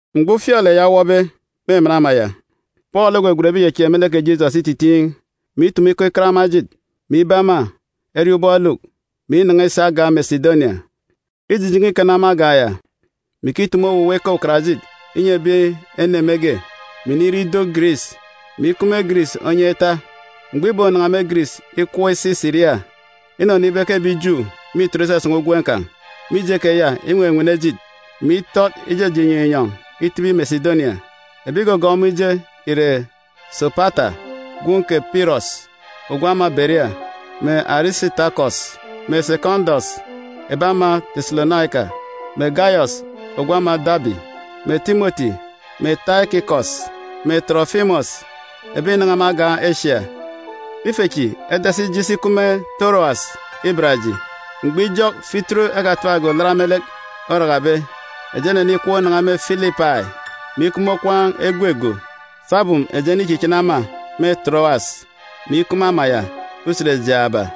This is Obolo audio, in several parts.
Mgbọ ufialek ya owọbe me ama ya, Pọọlu ogwegwen ebi ìchechieek me lek kè Jisọs ititiin̄, mè itumu ikọ ikat ema ejit, mè ibe ema eriọọn̄ ubọk eluk, mè inan̄a isi agan̄ Mesidonia. Îjijen̄e ikana me agan̄ ya, mè ikitumu owuwa ikọ ukarajit inyi ebi ene mege, mè inire ido Giris, mè ikup me Giris onyan̄ ita. Mgbọ ìbonan̄a me Giris ikọp isi Siria, inọnọ ibe ke ebi Ju mîtọt isasan̄a ugwem kan̄. Mije keya, inwenwene ejit, mè itọt ijeje inyọn̄ inyọn̄ itibi Mesidonia. Ebi ìgọgọọk ọmọ ije ìre Sopata gwun̄ kè Pirọs ogwu ama Beria, mè Arisitakọs mè Sekọndọs, ebi ama Teselonaika, mè Gayọs ogwu ama Dabi, mè Timọti mè Taikikọs mè Tọrọfimọs, ebi ìnan̄a me agan̄ Esia. Ife chi edasi ije isi ikup me Torowas iban eji. Mgbọ ijọk Fituru Kpunu Olat orakabe, eji enenikọp inan̄a me Filipai, mè ikup me okwaan̄ egwe go sabum eji enichichini ema me Torowas, mè ikup me ama ya usen jaaba.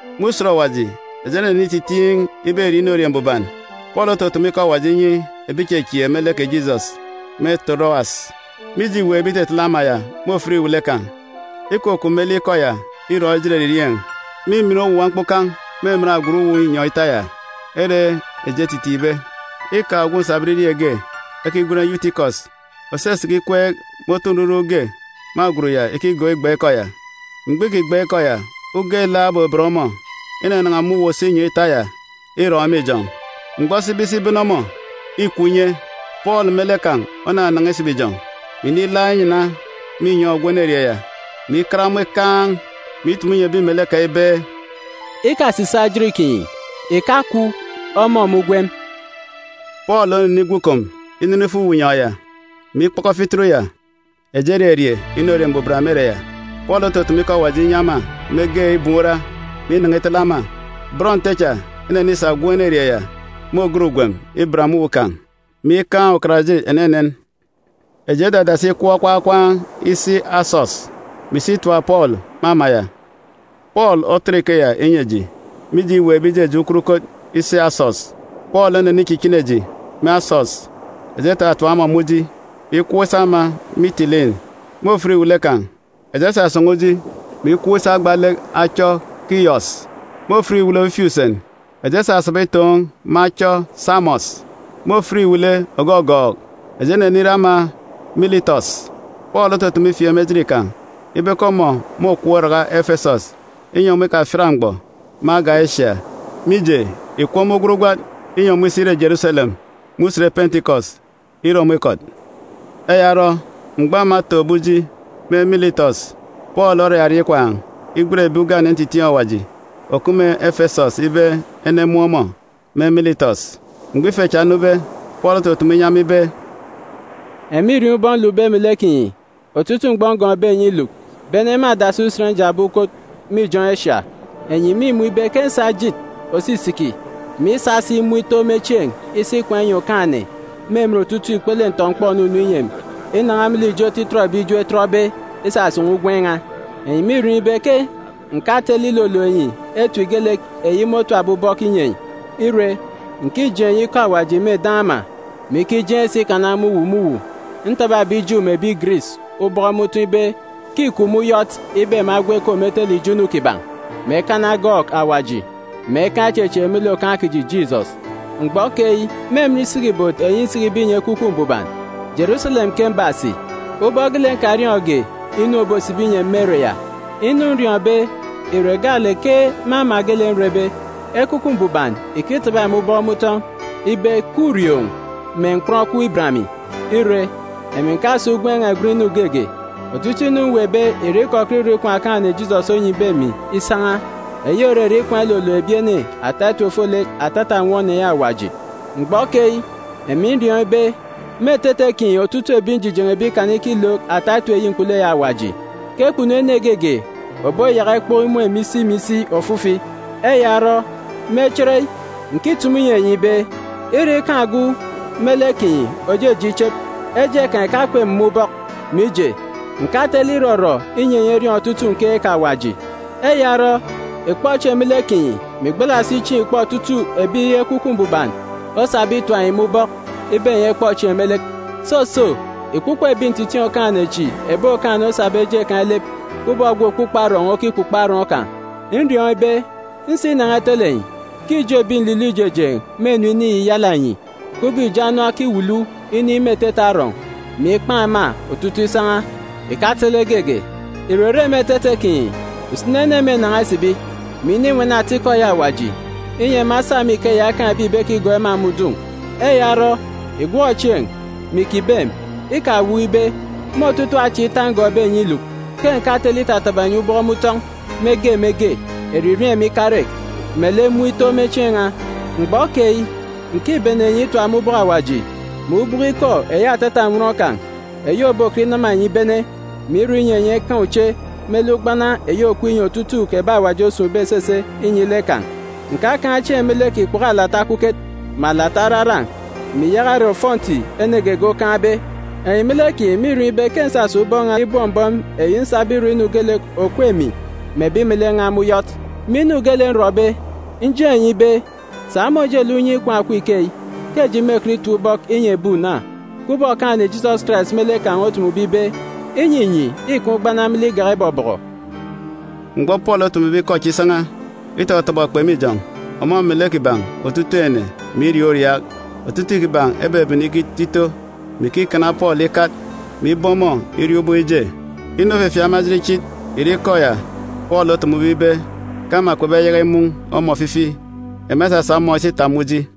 Me usen ògọọk Usen Mbuban, eji enenititiin̄ iberie inorie mbuban. Pọọlu otutumu ikọ Awaji inyi ebi ìchechieek me lek kè Jisọs me Torowas. Mije îweekbe itetele ama ya me ofit iwele kan̄, ikukup me lek ikọ ya irọn̄ ejit eririeen̄. Mîmin owuwa mkpukan̄ me emen agwut uwu inyọn̄ ita ya ere eji etitiin̄be. Îkaan̄ ogwu nsabọn irieen̄ ge ekigwen Yutikọs òsisiki ikweek me otu nruruk ge me agwut ya ikigọọk igban̄ ikọ ya. Mgbọ îkigban̄ ikọ ya, uga ilaak obeben ọmọ, inanan̄a me uwu òso inyọn̄ ita ya irọn̄ me ijọn̄. Mgbọ esibe isi ibene ọmọ, îkwu inye. Pọọlu me lek kan̄ onanan̄a isibi ijọn̄, mè inilaak inyana me inyọn̄ ogwu enerieen̄ ya, mè ikat ọmọ ikaan̄, mè itumu inyi ebi melek kan̄ ibe, “Ikasisaak ejit kinyi! Ìkakwu! Ọmọ me ugwem!” Pọọlu onenigwu ikom inene ifo uwu inyọn̄ ya, mè ikpọkọ fituru ya, eji ererie inorie mbuban me ere ya. Pọọlu otutumu ikọ Awaji inyi ema mege ibum ura, mè inan̄a itele ema. Bọn Nte cha enenisa gwun̄ enerieen̄ ya me ògat ugwem iban me uwu kan̄, mè ikaan̄ ukarajit enenen. Eji edadasi ikọp okwaan̄ okwaan̄ isi Asọs, mè isi itap Pọọlu me ama ya. Pọọlu otọt ikeya inyi eji, mije îweekbe ijeje ukot ukot isi Asọs. Pọọlu onenichichini eji me Asọs, eji etatap ọmọ me uji, mè ikọp isi ama Mitilin. Me ofit iwele kan̄, eji esasan̄a uji, mè ikọp isi agba lek achọ Kiyọs. Me ofit iwele ofifi usen, eji esasaba itoon̄ me achọ Samos. Me ofit iwele ògọgọọk, eji enenire ama Militọs. Pọọlu otutumu ifieek me ejit kan̄ ibe ke ọmọ môkọp iraka Efesọs, inyi ọmọ ikafiat mgbọ me agan̄ Esia, mije, ìkup ọmọ ugwat ugwat, inyi ọmọ isi ire Jeruselem me usen Pentikọs, ire ọmọ ikọt. Eya orọ, mgbọ ema etoon̄be me ijọn̄ me Militọs, Pọọlu oraria ikwaan̄ igwen ebi ugane ntitiin̄ Awaji òkup me Efesọs ibe enemun̄ ọmọ me Militọs. Mgbọ ife cha enube, Pọọlu otutumu inyi ema ibe, “Enyi mîriọọn̄ ubọk nlukbe melek kinyi otutuuk mgbọ ngọọkbe enyi iluk, bene me adasi usen njakbe ukot me ijọn̄ Esia. Enyi mîmun̄ ibe ke ǹsa ejit òsisiki mè isa si mun̄ ito me chieen̄ isi ikwaan̄ inyi Okaan̄-ene me emen otutuuk ikpele ntọ-mkpọ ònunu inyi emi inan̄a me lek ijo otitọt ebi Ju etọtbe isasan̄a ugwem n̄a. Enyi mîriọọn̄ ibe ke ǹkatele ilolook enyi etip geelek eyi môtapbe ubọk inyi enyi. Ire, ǹkijeen̄ enyi ikọ Awaji me eden̄ ama, mè ikijeen̄ si ikana me uwu me uwu. Ntaba ebi Ju mè ebi Giris ubọk me utọn̄ ibe ke îkup me uyọt ibe ema egwu ekom etele ijo inu kiban̄, mè ekana egọọk Awaji, mè ekaan̄ ichechieek me lek Okaan̄ kiji, Jisọs. “Mgbọ keyi, me emen isiki ibot eyi nsikibe inyi Ekwukwu Mbuban, Jeruselem ke mbasi, ubọk geelek nkariọọn̄ge inu òbosibi inyi emi me ere ya. Inu nriọọn̄be ìre gaalek ke me ama geelek nrebe, Ekwukwu Mbuban ìkitaba emi ubọk me utọn̄ ibe ke ùrioon̄ mè mkpọn okup iban emi. Ire, emi ǹkasa ugwem n̄a ìgwen inu geege. Otutuuk inu mweekbe ìre ikọkọt irọ ikwaan̄ Okaan̄-ene Jisọs onyibe emi isan̄a, eyi òrere ikwaan̄ ilolook ebi ene ata etip ofolek atata nnwọn eyi Awaji. “Mgbọ keyi, emi nriọọn̄ ibe, me etete kinyi otutuuk ebi njijen̄ebe ikana ikilook ata etip eyi mkpulu eyi Awaji, ke kpunu ene geege òboyaka ikpọk imun̄ emi isi mè isi ofifi. Eya orọ, me chereyi, ǹkitumu inyi enyi ibe, ire ikaan̄ ogwu melek kinyi òjeje ichep, eje kan̄ ìkakup emi me ubọk. Mije, ǹkatele irọrọ inyi enyi eriọọn̄ otutuuk nkeek Awaji. Eya orọ, ìkpọ chieen̄ me lek kinyi, mè ìgbala si chieen̄ ìkpọ otutuuk ebi Ekwukwu Mbuban osabe itap enyi me ubọk ibe enyi ekpọ chieen̄ me lek. Soso, ìkpukpo ebi ntitiin̄ Okaan̄-ene chi ebi Okaan̄-ene osabe eje kan̄ ilep, kubọk ogwu òkpukpo arọọn̄ okikpukpo arọọn̄ kan̄. “Nriọọn̄ ibe, nsinan̄a itele enyi, ke ijo ebi nlilọ ijejeen̄ mênu iniyiyala enyi, kubọk ibo oron okiwulu inin̄ me etete arọọn̄, mè ikpan̄ ema otutuuk isan̄a, ìkatele geege. Ìrere me etete kinyi, usini ene mênan̄a isibi, mè ininwene atikọ eyi Awaji, inyi ema esa me ikeya ekaan̄ ebi ìbekigọọk ema me udun̄. Eya orọ, ìgwọk chieen̄, mè ìkibem! Ikawuuk ibe, me otutuuk acha ita ngọọkbe enyi iluk, ke ǹkatele itataba enyi ubọk me utọn̄, me ge me ge, eririeen̄ mè ikarek, melek mun̄ ito me chieen̄ n̄a. “Mgbọ keyi, ǹkibene enyi itap me ubọk Awaji, mè ubọk ikọ eyi atata nnwọn kan̄, eyi òbokọt inama enyi ibene, mè irọ inyi enyi ekaan̄ uche me lek ugbana eyi òkup inyi otutuuk ebi Awaji osun̄be esese inyi lek kan̄. Ǹkakaan̄ chieen̄ ile me lek ikpoko alata okuket, mè alata araran̄, mè ìyaka ire ofọnti ene geege okaan̄be. Enyi me lek kinyi mîriọọn̄ ibe ke ǹsasa ubọk n̄a chi ibọm mbọm eyi nsabe irọ inu geelek òkup emi mè ebi melek n̄a me uyọt. Me inu geelek nrọbe, njeen̄ enyi ibe, sa me ojelek unye ikwaan̄ òkup ikeyi, ke eji mêkọt itap ubọk inyi ebi una, kubọk Okaan̄-ene Jisọs Karais me lek kan̄ otumube ibe, ‘Inyinyi îkaan̄ ugbana me lek igak ibọbọkọ.’” Mgbọ Pọọlu otumube ikọ chi isan̄a, itọtọbọ ekpe me ijọn̄, ọmọ melek kiban̄ otutuuk ene, mè iriaak uriaak. Otutuuk kiban̄ ebebene ikito ito, mè ikikana Pọọlu ikat, mè ibe ọmọ iriọọn̄ ubọk ije. Inu òfefieek ema ejit ichit ìre ikọ ya Pọọlu otumube ibe ke ema kpebeyaka imun̄ ọmọ ofifi. Ema esasa ọmọ isi itap me uji.